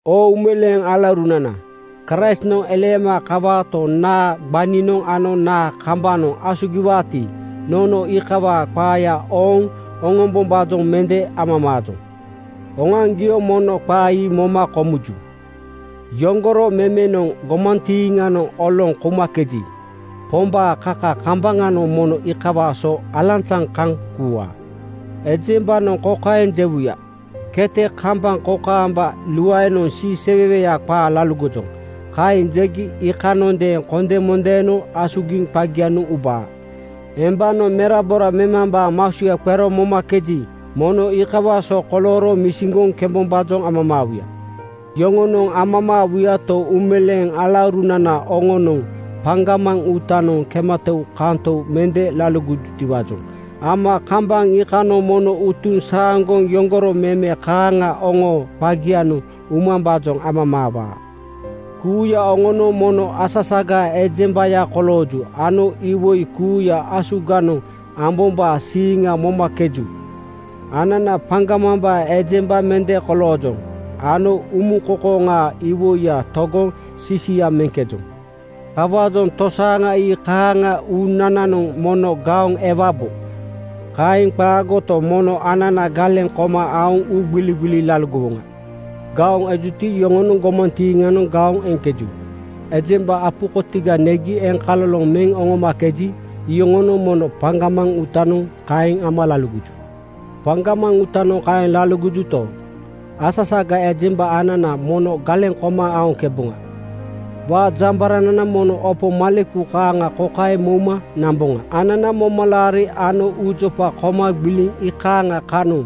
Oo uumeleeŋ alaurunana, Kraistnoŋ eleema kawaato, naa gbaninoŋ ano naa kambanoŋ asugiwaati, nono iikawaa qaaya ooŋ oŋombombaajoŋ mende amamaajoŋ. Oŋoaŋgio mono qaa ii kokaeŋ moma komuju: Yoŋgoro memenoŋ gomantiiŋanoŋ oloŋ koumakeji, Pombaa kaka kambaŋanoŋ mono iikawaa so alanzaŋ kaŋ kuuwaa. Ejembanoŋ kokaeŋ jewuya, “Kete kambaŋ kokaamba luaenoŋ siiseweweya qaa laligojoŋ.” Kaeŋ jegi iikanondeeŋ kondemondeenoŋ asugiŋ qagianoŋ ubaa. Embanoŋ merabora memambaa masuya qero momakeji, mono iikawaa so kolooro misiŋgoŋ kembombaajoŋ amamaawuya. Yoŋonoŋ amamaawuyato, uumeleeŋ alaurunana, oŋonoŋ paŋgamaŋ uutanoŋ kematoukantou mende laligojutiwaajoŋ ama kambaŋ iikanoŋ mono utuŋ saaŋgoŋ yoŋgoro meme kaaŋa oŋoo qagianoŋ umambaajoŋ amamaawaa. Kuuya oŋonoŋ mono asasagaa ejembaya kolooju ano iwoi kuuya asuganoŋ ambombaa siiŋa momakeju. Anana paŋgamambaa ejemba mende koloojoŋ ano umuŋkoŋkoŋaa iwoiya togoŋ sisia meŋkejoŋ. Kawaajoŋ tosaaŋa ii kaaŋa uunananoŋ mono gaoŋ ewabo. Kaeŋ qaagoto, mono anana galeŋ koma aoŋ uugbiligbili laligowoŋa. Gaoŋ ejuti, iyoŋonoŋ gomantiiŋanoŋ gaoŋ eŋkeju. Ejemba apu kotiga negi eŋkaloloŋ meŋ oŋomakeji, iyoŋonoŋ mono paŋgamaŋ uutanoŋ kaeŋ ama laligoju. Paŋgamaŋ uutanoŋ kaeŋ amakejuto, asasagaa ejemba anana mono galeŋ koma aoŋkeboŋa. Waajambaranana mono opo maleku kaaŋa kokaeŋ mouma namboŋa: Anana momalaari ano uujopa koma gbiliŋ iikaaŋa kanoŋ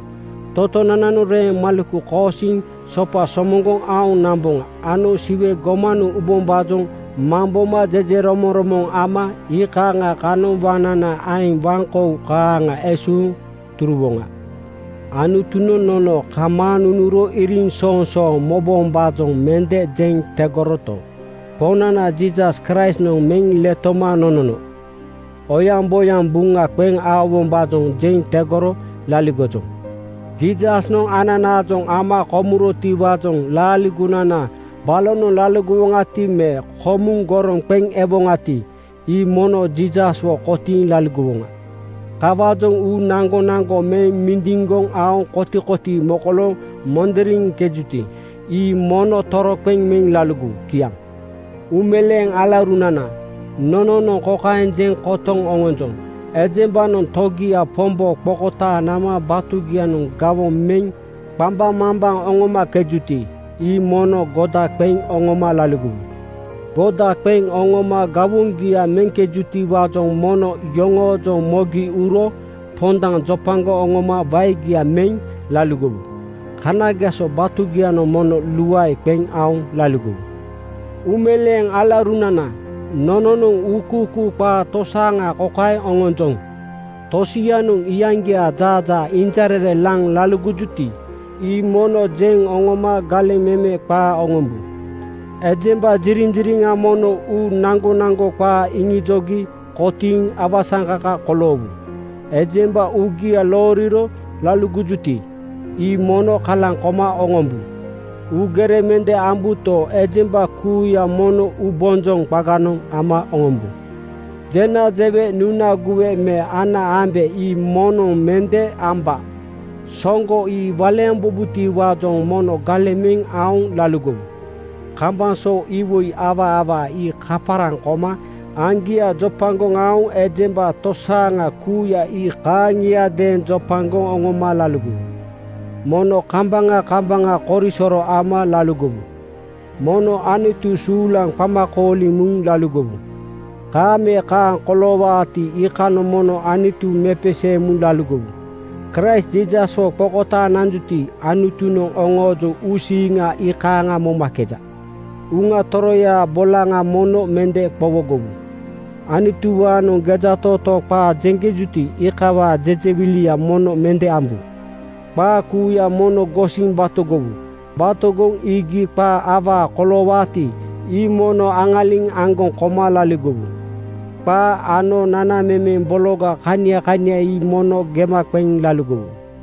totonananoŋ reeŋ maleku koosiŋ (reeŋ kaaŋa besaaŋ) sopa somoŋgoŋ aoŋ namboŋa ano Siwe gomanoŋ ubombaajoŋ mamboma jejeromoŋromoŋ ama iikaaŋa kanoŋ waŋnana aeŋ waŋkou kaaŋa esuuŋ turuwoŋa. Anutunoŋ nono kamaaŋ nunuro iriŋsoŋsooŋ mobombaajoŋ mende jeŋ tegoroto, Poŋnana Jiisas Kraistnoŋ meŋ letoma nonono oyaŋboyaŋ buŋa qeŋ aowombaajoŋ jeŋ tegoro laligojoŋ. Jiisasnoŋ ananaajoŋ ama komurotiwaajoŋ laaligonana balonoŋ laligowoŋati me komuŋ goroŋ qeŋ ewoŋati, ii mono Jiisaswo kotiiŋ laligowoŋa. Kawaajoŋ uu naŋgonaŋgo meŋ mindiŋgoŋ aoŋ kotikotii mokolooŋ mondoriŋkejuti, ii mono toroqeŋ meŋ laligowu. Kiaŋ. Uumeleeŋ alaurunana, nononoŋ kokaeŋ jeŋ kotoŋ oŋonjoŋ: Ejembanoŋ togia Pombo qokotaaŋ nama batugianoŋ gawoŋ meŋ qambaŋmambaŋ oŋomakejuti, ii mono goda qeŋ oŋoma laligowu. Goda qeŋ oŋoma gawoŋgia meŋkejutiwaajoŋ mono yoŋoojoŋ mogi uro pondaŋ jopagoŋ oŋoma waegia meŋ laligowu. Kanageso batugianoŋ mono luae qeŋ aoŋ laligowu. Uumeleeŋ alaurunana, nononoŋ uukuukuu qaa tosaaŋa kokaeŋ oŋonjoŋ: Tosianoŋ iyaŋgiaa jaajaa injarere laŋ laligojuti, ii mono jeŋ oŋoma galeŋ meme qaa oŋombu. Ejemba ziriŋziriŋa mono uu naŋgonaŋgo qaa iŋijogi kotiiŋ awasaŋkaka koloowu. Ejemba uugia looriro laligojuti, ii mono kalaŋ koma oŋombu. Uugere mende ambuto, ejemba kuuya mono uubonjoŋ qaganoŋ ama oŋombu. Jena jewe, nuna guwe me ana ambe ii moŋnoŋ mende amba. Soŋgo ii waleembubotiwaajoŋ mono galeŋ meŋ aoŋ laligowu. Kambaŋ so iwoi awaa awaa ii kaparaŋ koma aŋgia jopagoŋ aoŋ ejemba tosaaŋa kuuya ii kaaŋiadeeŋ jopagoŋ oŋoma laligowu. Mono kambaŋa kambaŋa korisoro ama laligowu! Mono Anutu suulaŋ qama kooliŋ muŋ laligowu! Kaaŋ me kaaŋ koloowaati, iikanoŋ mono Anutu mepeseeŋ laligowu! Kraist Jiisaswo qokotaaŋ nanjuti, Anutunoŋ oŋoojoŋ uusiiŋa iikaaŋ momakeja. Uŋa Toroyaa bolaŋa mono mende qowogowu. Anutuwaanoŋ gejatootoo qaa jeŋkejuti, iikawaa jejewilia mono mende ambu. Qaa kuuya mono gosiŋ batogowu. Batogoŋ iigi qaa awaa koloowaati, ii mono aŋaliŋ aŋgoŋ koma laligowu. Qaa ano nanamemeŋ bologa kania kania ii mono gema qeŋ laligowu.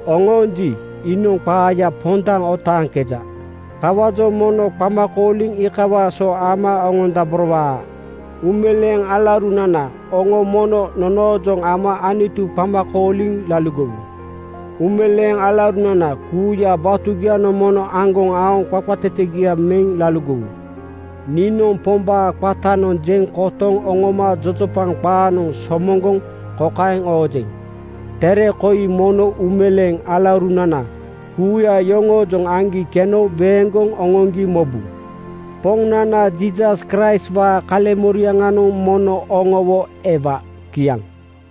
Oŋoonji, iinoŋ qaaya pondaŋ otaaŋkeja. Kawaajoŋ mono qamakooli iikawaa so ama oŋondaborowaa. Uumeleeŋ alaurunana, oŋo mono nonoojoŋ ama Anutu qama kooliŋ laligowu. Uumeleeŋ alaurunana kuuya batugianoŋ mono aŋgoŋ aoŋ qaqatetegia meŋ laligowu. Niinoŋ Pombaa qatanoŋ jeŋ kotoŋ oŋoma jojopaŋ qaanoŋ somoŋgoŋ kokaeŋ oojeŋ: Tere koi mono uumeleeŋ alaurunana kuuya yoŋoojoŋ aŋgi keno weeŋgoŋ oŋoŋgi mobu. Poŋnana Jiisas Kraistwaa kaleŋmoriaŋanoŋ mono oŋowo ewa. Kiaŋ.